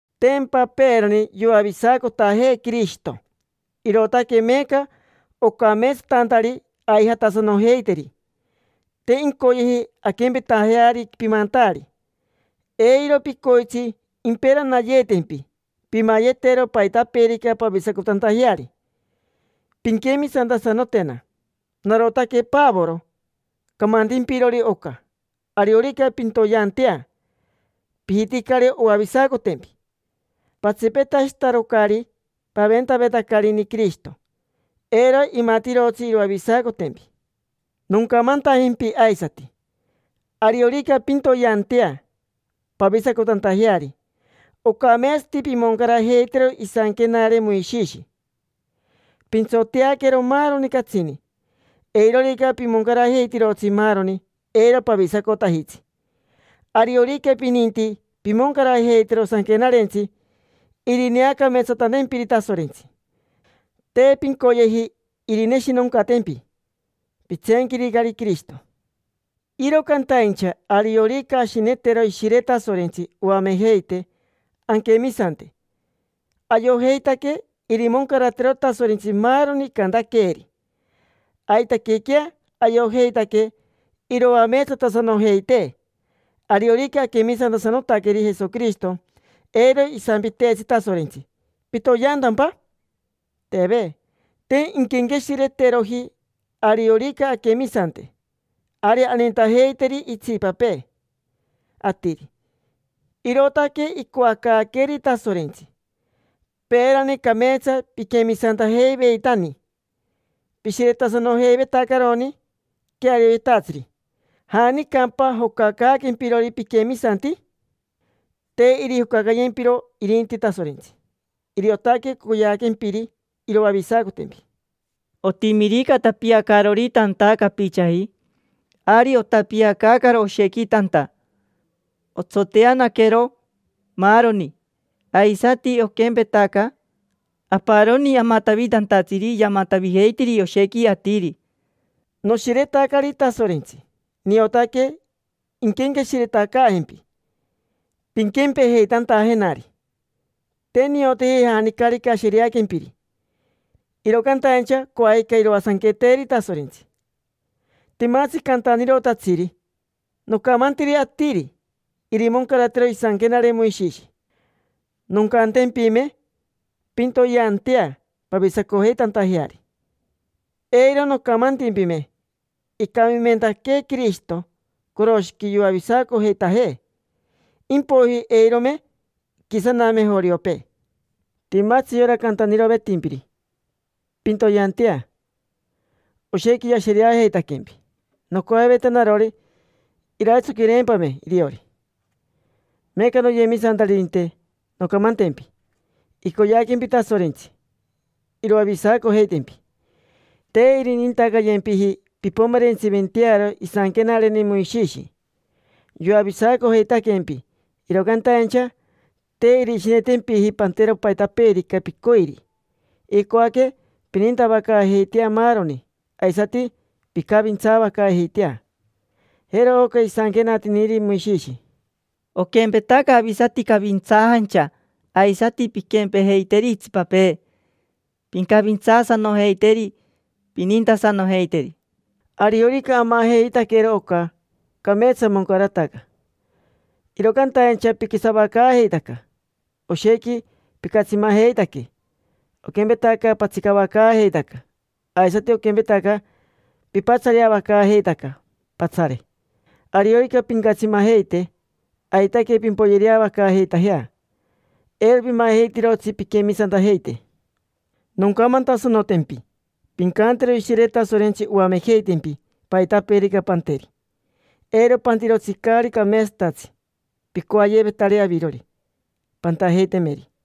Tempa peerani yoavisacotajee Quirishito, irootaque meeca ocameetsatantari aijatasanojeiteri. Te incoyeji anquempetajeari pimantaari. Eiro picoitsi imperanayeetempi pimayetero paitapeerica pavisacotantajeari. Pinquemisantasanotena. Narotaque Pavoro camantimpirori oca. Ariorica pintoyeantea, pijiticari oavisacotempi; patsipetashitarocari paventavetacarini Quirishito, eiro imatirotsi iroavisacotempi. Noncamantajempi aisati: ariorica pintoyeantea pavisacotantajeari, ocameetsati pimoncarajeitero isanquenare Moishishi, pintsoteaquero maaroni catsini. Eirorica pimoncarajeitirotsi maaroni, eiro pavisacotajitsi. Ariorica pininti pimoncarajeitero sanquenarentsi irineacameetsatantempiri Tasorentsi, te pincoyeji irineshinoncatempi. Pitseenquiricari Quirishito. Iro cantaincha ariorica ashinetero Ishire Tasorentsi oamejeitee anquemisante, ayojeitaque irimoncaratero Tasorentsi maaroni icantaqueeri. Aitaquequea ayojeitaque iroameetsatasanojeitee. Ariorica aquemisantasanotaqueri Jesoquirishito, eiro isampiteetsi Tasorentsi: “¿Pitoyeantampa?” Teve. Te inquenqueshireteroji. Ariorica anquemisante, ari anintajeiteri itsipapee atiri. Irootaque icoacaaqueeri Tasorentsi. Peerani cameetsa piquemisantajeiveitani. Pishiretasanojeivetacaroni quearioyetatsiri. ¿Janicampa jocacaaquempirori piquemisanti? Te irijocacayempiro irinti Tasorentsi. Iriotaque coyeaquempiri iroavisacotempi. Otimirica tapiacaarori tanta capichaji, ari otapiacaacaro oshequi tanta, otsoteanaquero, maaroni. Aisati oquempetaca, aparoni amatavitantatsiri yamatavijeitiri oshequi atiri. Noshiretacari Tasorentsi, niotaque inquenqueshiretacaajempi, pinquempejeitantajenari. Te nioteji janicarica ashereaquempiri, iro cantaincha coajica iroasanqueteri Tasorentsi. Timatsi cantanirotatsiri nocamantiri atiri irimoncaratero isanquenare Moishishi. Noncantempime: “Pintoyeantea pavisacojeitantajeari”, eiro nocamantimpime: “Icamimentaquee Quirishito coroshiqui yoavisacojeitajee”. Impoiji eirome iquisaname joriopee. Timatsi yora cantanirovetimpiri pintoyeantea, oshequi yashereajeitaquempi. Nocoaveta narori iraitsoquireempame iriori. Meeca, noyemisantaririnte, noncamantempi. Icoyeaquempi Tasorentsi iroavisacojeitempi, te irinintacayempiji pimpomerentsiventearo isanquenareni Moishishi. Yoavisacojeitaquempi, iro cantaincha te irishinetempiji pantero paitapeerica picoiri. Icoaque pinintavacaajeitajea maaroni, aisati pincavintsavacaajeitajea. Jero oca isanquenatiniri Moishishi: “Oquempetaca avisati cavintsaajancha, aisati pinquempejeiteri itsipapee, pincavintsaasanojeiteri, pinintasanojeiteri”. Ariorica amajeitaquero oca, cameetsa. Moncarataca. Iro cantaincha piquisavacaajeitaca, oshequi picatsimajeitaque: oquempetaca patsicavacaajeitaca, aisati oquempetaca pipatsareavacaajeitaca, patsare. Ariorica pincatsimajeite, aitaque pimpoyereavacaajeitajea; eiro pimajeitirotsi pinquemisantajeite. Noncamantasanotempi: pincantero Ishire Tasorentsi oamejeitempi paitapeerica panteri. Eiro pantirotsi caari cameetsatatsi picoayevetari avirori pantajeitemeri.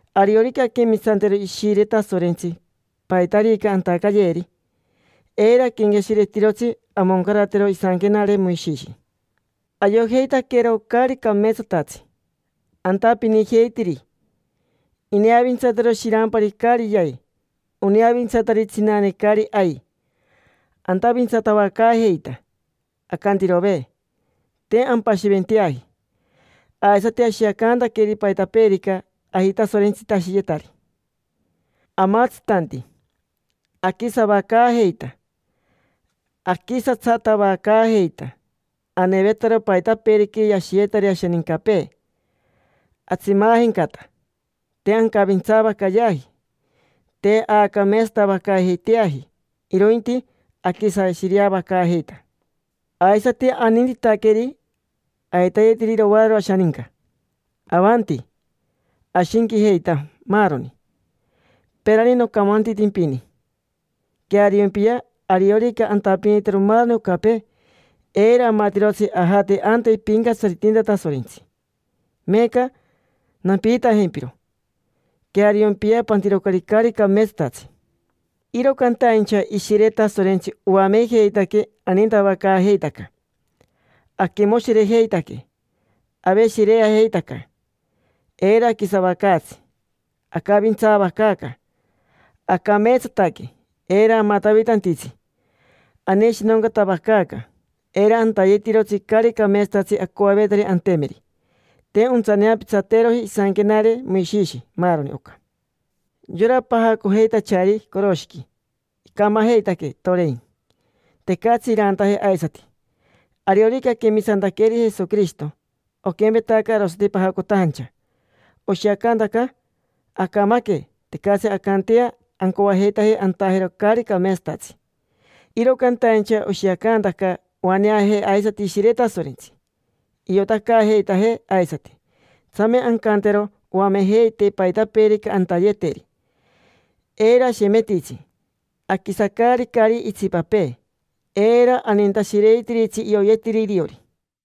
Ariorica anquemisantero Ishire Tasorentsi paitarica antacayeeri, eiro aquenqueshiretirotsi amoncaratero isanquenare Moishishi. Ayojeitaquero caari cameetsatatsi antapinijeitiri: ineavintsatiro shirampari caari yai, oneavintsatiri tsinane caari ai, antavintsatavacaajeita: acantirove, te ampashiventeaji. Aisati ashiacantaqueri paitapeerica ajitasorentsitashiyetari, amatsitanti, aquisavacaajeita, aquisatsatavacaajeita, anevetaro paitapeerica yashiyetari ashanincapee, atsimaajencata, te ancavintsaavacayeaji, te aacameetsatavacaajeiteaji, irointi aquisashireavacaajeita. Aisati anintitaqueri aitayeteri irovaararo ashaninca, avanti, ashinquijeita, maaroni. Peerani nocamantitimpini: “Queariompiya. Ariorica antapinitero maaroni ocapee, eiro amatirotsi ajate anta ipincatsaritinta Tasorentsi”. Meeca nampiitajempiro: “Queariompiya. Pantirocari caari cameetsatatsi”. Iro cantaincha Ishire Tasorentsi oamejeitaquee anintavacaajeitaca, aquimoshirejeitaque, aveshireajeitaca, eiro aquisavacaatsi, acavintsavacaaca, acameetsataque, eiro amatavitantitsi, aneshinoncatavacaaca, eiro antayetirotsi caari cameetsatatsi acoavetari antemeri. Te ontsaneapitsateeroji isanquenare Moishishi maaroni oca. Yora pajacojeitachari coroshiqui icamajeitaque, torein: tecatsi irantaje aisati. Ariorica aquemisantaqueri Jesoquirishito, oquempetaca arosati pajacotajancha, oshiacantaca acamaque, tecatsi ancantea ancoajeitaje antajero caari cameetsatatsi. Iro cantaincha oshiacantaca oaneajee aisati Ishire Tasorentsi, iotacaajeitajee aisati. Tsame ancantero oamejeitee paitapeerica antayeteri. Eiro ashemetitsi, aquisacaaricari itsipapee. Eiro anintashireitiritsi ioyetiri iriori.